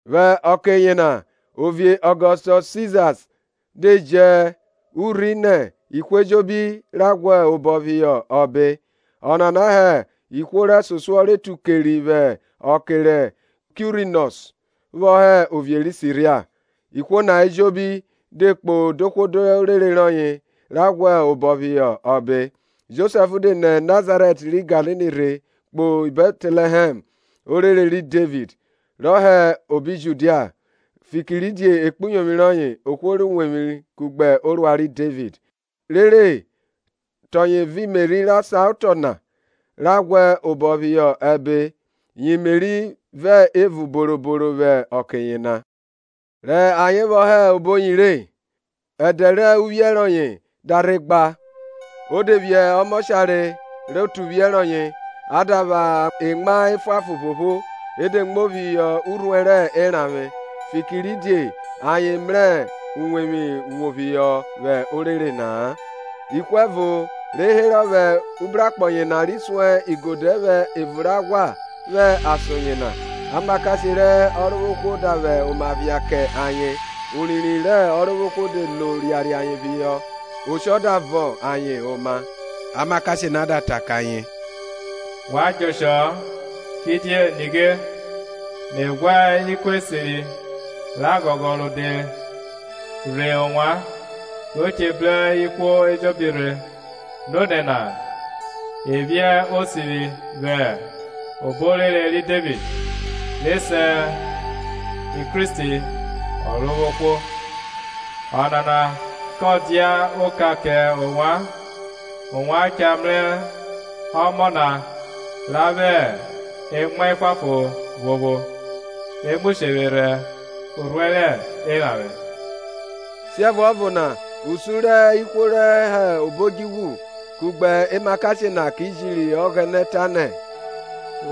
Vwẹ ọke yena ovie Ọgọstọs Siza de ji urhi nẹ ihwo ejobi ra ghwẹ odẹ phihọ ọbe. Ọnana hẹ ihwo rẹsosuọ ra tu keri, vwẹ ọke ri Kuirinọs vwọ hẹ ovie ri Siria. Ihwo na ejobi de kpo dohwo dorere rọye ra ghwẹ odẹ phihọ ọbe. Josẹf de nẹ Nazaret ri Galili rhe, kpo Bẹtlẹhẹm, orere ri Devid, rọ hẹ obi Judia, fikiridie ekpuyovwi rọye ohwo rẹ uwevwi kugbe orua ri Devid, rere te ọye vẹ Meri rọ saotọ na, ra ghwẹ odẹ phihọ ọbe, yi Meri vẹ evun boroboro vwẹ ọke yena. Rẹ ayen vwọ hẹ oboyi re, ẹdẹ rẹ uvwiẹ rọye da rhe gba. O de vwiẹ ọmọshare rẹ ọtuvwie rọye a da vwẹ emwa efuanfon phopho, e de muo phihọ urhuẹ rẹ eranvwe, fikiridie ayen mrẹ uwevwi wo phihọ vwẹ orere na-a. Ihwo ẹvo herọ vwẹ ubrakpọ yena ri sun igodẹ vwẹ evun rẹ aghwa vwẹ ason yena. Amakashe rẹ Ọrovwohwo da vwẹ oma phia kẹ ayen, urinrin rẹ Ọrovwohwo de lo riariẹ ayen phihọ, oshọ da vọn ayen oma. Amakashe na da ta kẹ ayen, wa djẹ oshọ-ọ; kidie nighe, me ghwa ikun esiri rẹ aghọghọ rode rhe ovwan ro che bru ihwo ejobi rhe; Nonẹ na e vwiẹ Osivwi vwẹ obo orere ri Devid, re se Kristi Ọrovwohwo. Ọnana kọ dia oka kẹ ovwan; ovwan cha mrẹ ọmọ na ra vwẹ emwa efuanfon phopho re mu shevwerhẹ urhuẹ rẹ eranvwe. Siẹvuọvo na usun rẹ ihwo rẹ obo odjuvwu kugbe emakashe na ki jiri Ọghẹnẹ tanẹ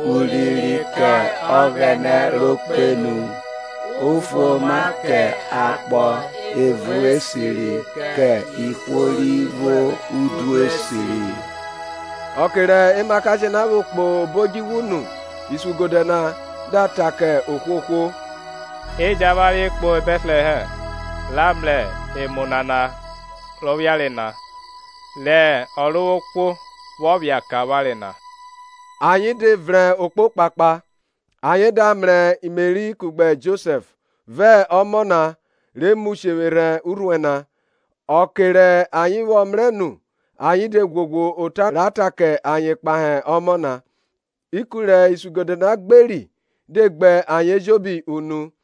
Urinrin kẹ Ọghẹnẹ ro kpenu, ufuoma kẹ akpọ evun esiri kẹ ihwo ri vwo udu esiri. Ọke re emakashe na vwo kpo obo odjuvwu nu, isuigodẹ na da ta kẹ ohwohwo, E jẹn avwanre kpo Bẹtlẹhẹm ra mrẹ emu nana rọ phiare na, rẹ Ọrovwohwo vwọ phia kẹ avwanre na. Ayen da yanrhe okpokpakpa, ayen da mrẹ Meri kugbe Josẹf, vẹ ọmọ na re mu sherhẹ urhuẹ na. Ọke rẹ ayen vwọ mrẹ nu ayen de ghwoghwo ota ra ta kẹ ayen kpahe ọmọ nana; ikun rẹ isnigodẹ na gberi de gbe ayen ejobi unu.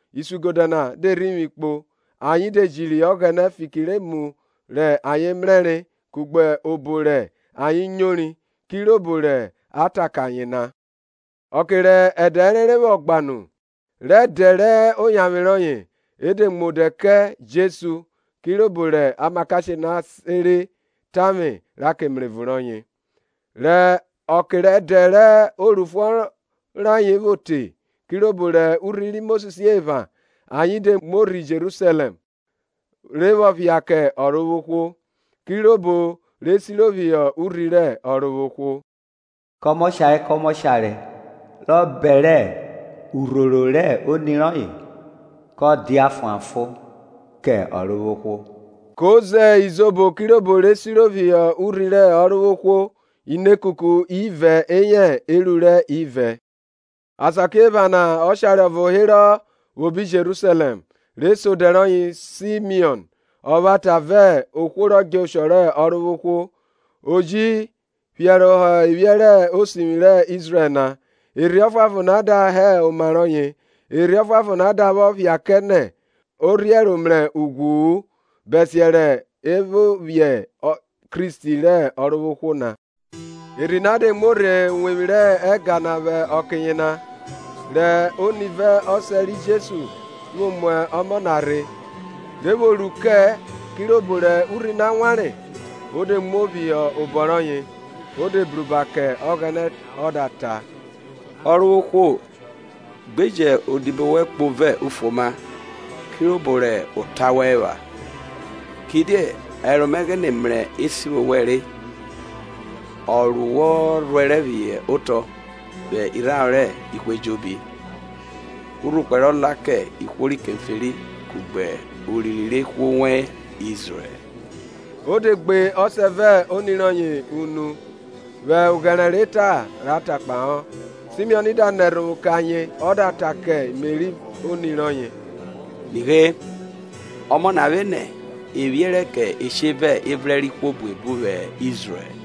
Isuigodẹ na de rhivwi kpo, ayen de jiri Ọghẹnẹ fiki rẹ emu rẹ ayen mrẹre kugbe obo rẹ ayen nyori, kirobo ra ta kẹ ayen na. Ọke rẹ ẹdẹ ẹrenre vwọ gba nu, rẹ ẹdẹ oyanvwe rọye, e de mu odẹ kẹ Jesu, kirobo rẹ emakashe na sere kẹ tavwe ra ke mrevun rọye. Rẹ ọke rẹ ẹdẹ rẹ orufuọn rayen vwo re kirobo rẹ urhi ri Mosis epha, ayen de muo rhe Jerusalẹm re vwọ phia kẹ Ọrovwohwo, (Kirobo re siro phihọ urhi rẹ Ọrovwohwo, kọmọshare kọmọshare rọ bẹrẹ urhoro rẹ oni rọye kọ dia fuanfon kẹ Ọrovwohwo) ko ze izobo kirobo re siro phihọ urhi rẹ Ọrovwohwo, inekuku ivẹ eyẹ erurẹ ivẹ. Asakiephana ọshare ọvo herọ vwẹ obi Jerusalẹm, re se odẹ rọye Simiọn, ọvwata vẹ ohwo rọ djẹ oshọ rẹ Ọrovwohwo, o ji phiẹrohọ evwiẹ rẹ Osivwi rẹ Izrẹl na, Erhi Ọfuanfon da hẹ oma rọye. Erhi Ọfuanfon na da vwọ phia kẹ nẹ o rhie ẹro mrẹ ughwu-u bẹsiẹ rọ vwọ mrẹ Kristi rẹ Ọrovwohwo na. Erhi na de muo rhe uwevwi rẹ ẹga vwẹ ọke yena, rẹ oni vẹ ọsẹ ri Jesu vwo mu ọmọ na rhe, re vwo ru kẹ kirobo rẹ urhi wanre, o de muo phihọ obọ rọye o de bruba kẹ Ọghẹnẹ ọ da ta, Ọrovwohwo, gbe jẹn odibo wẹn kpo vẹ ufuoma, kirobo rẹ ota wẹn epha; kidie ẹro mẹ ghine mrẹ esivwo wẹn re ọ ru wọ rhuẹrẹ phihọ otọ vwẹ irharo rẹ ihwo ejobi, urhukpẹ rọ la kẹ ihwo ri keferi kugbe urinrin rẹ ihwo wẹn Izrẹl. O de gbe ọsẹ vẹ oni rọye unu vwẹ oghẹre rẹ eta ra ra kpahọ; Simiọn da nẹ ẹrhovwo kẹ ayen ọ da ta kẹ Meri oni rọye Nighe, ọmọ na vwenẹ e vwiẹrẹ kẹ eshe vẹ evrẹn rẹ ihwo buebu vwẹ Izrẹl,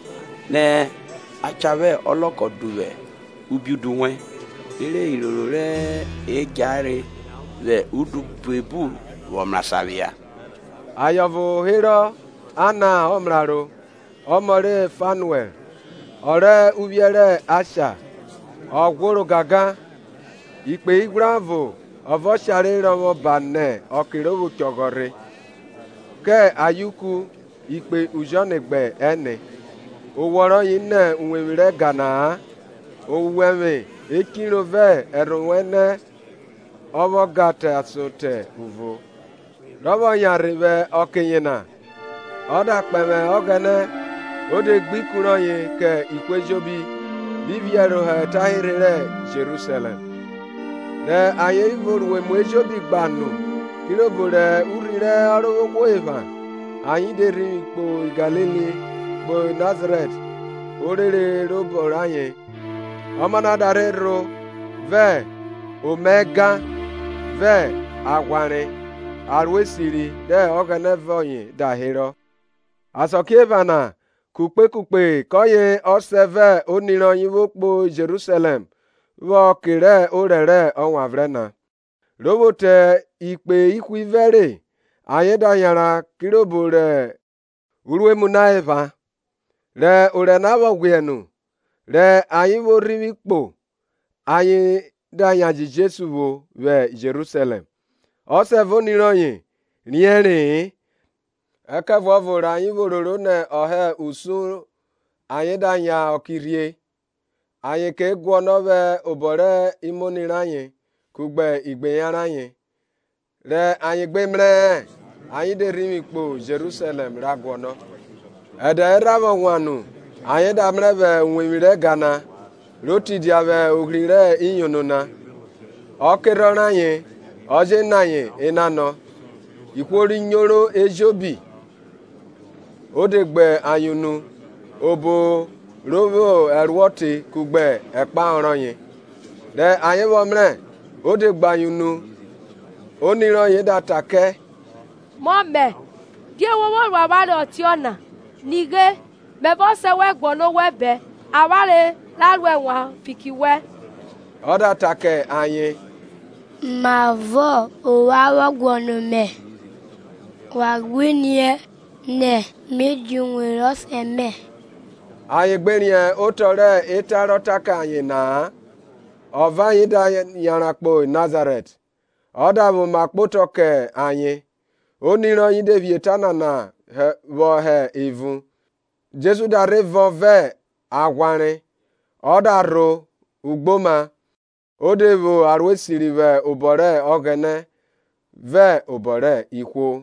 (nẹ a cha vwẹ ọlọkọ duvwu ubiudu wẹn) rere iroro re djahere vwẹ udu buebu vwọ mrasan phia. Aye ọvo herọ Anna ọmraro, ọmọ ri Fanuẹl, ọ rẹ uvwiẹ rẹ Asha; ọ ghworo gangan, ikpe ighwrẹ ọvo ọ vẹ ọshare rọvwọ ba nẹ ọke ro vwo chọghọ rhe, kẹ ayeuku ikpe ujọne gbẹ ẹne. Owọ rọye nẹ uwevwi rẹ ẹga na-a, owẹvwe echiro vẹ ẹrhovwo ẹnẹ ọ vwọ ga te ason te uvo. Rọ vwọ yanrhe vwẹ ọke yena ọ da kpẹvwẹ Ọghẹnẹ o de gbe ikun rọye kẹ ihwo ejobi ri phiẹrohọ etanhirhe ri Jerusalẹm. Rẹ ayen vwo ru emu ejobi gba nu kirobo rẹ urhi rẹ Ọrovwohwo epha, ayen de rhivwi kpo Galili, kpo Nazarẹt, orere robọ rayen. Ọmọ na da rho vẹ omaẹga, vẹ aghwanre; ẹroesiri rẹ Ọghẹnẹ vẹ ọye da herọ. Asakiephana kukpe kukpe kọye ọsẹ vẹ oni rọye vwo kpo Jerusalẹm vwẹ ọke orẹ rẹ Ewanvrẹn na. Ro vwo te ikpe ihwivẹ re, ayen da yanran kirobo rẹ urnemu na epha; rẹ orẹ na vwọ ghwiẹ nu, rẹ ayen vwo rhivwi kpo, ayen da yan jẹ Jesu vwo vwi Jerusalẹm. Ọsẹ vẹ oni rọye riẹnre-e, Ẹkẹvuọvo rẹ ayen vwo roro nẹ ọ hẹ usun, ayen da yan kẹ ọke rhie, ayen ke guọnọ vwẹ obọ rẹ imoni rayen kugbe igbeyan rayen; Rẹ ayen gbe mrẹ-ẹ, ayen de rhivwi kpo Jerusalẹm, ra guọnọ. Ẹdẹ erha vwọ wan nu ayen da mrẹ vwẹ uwevwi rẹ ẹga na, ro tidia vwẹ ohri rẹ iyono na, ọ kerhọn rẹ ayen ọ je nọ ayen enanọ; ihwo ri nyoro ejobi o de gbe ayen unu obo ro vwo ẹruọ te kugbe ekpahọ rọye. Rẹ ayen vwọ mrẹ o de gbe ayen unu; oni rọye da ta kẹ, Mọmẹ, Die wo vwo ru avwanre ọtiọna? Nighe, me vẹ ọsẹ wẹn guọnọ owẹ bẹn avwanre ra ro ẹnwan fiki wẹn. Ọ da ta kẹ ayen, Mavọ ovwan vwọ guọnọ ovwẹ? Wa gbe riẹn nẹ me dia uwevwi rẹ ọsẹ mẹ? Ayen gbe riẹn otọ rẹ eta ra ta kẹ ayen na-a. Ọ vẹ ayen da yanran kpo Nazarẹt, ọ da vwẹ oma kpotọ kẹ ayen; oni rọye de phi eta nana vwọ hẹ evun. Jesu da rhe vọn vẹ aghwanre, ọ da rho ugboma, o de vwo ẹroesiri vwẹ obọ rẹ Ọghẹnẹ vẹ obọ rẹ ihwo.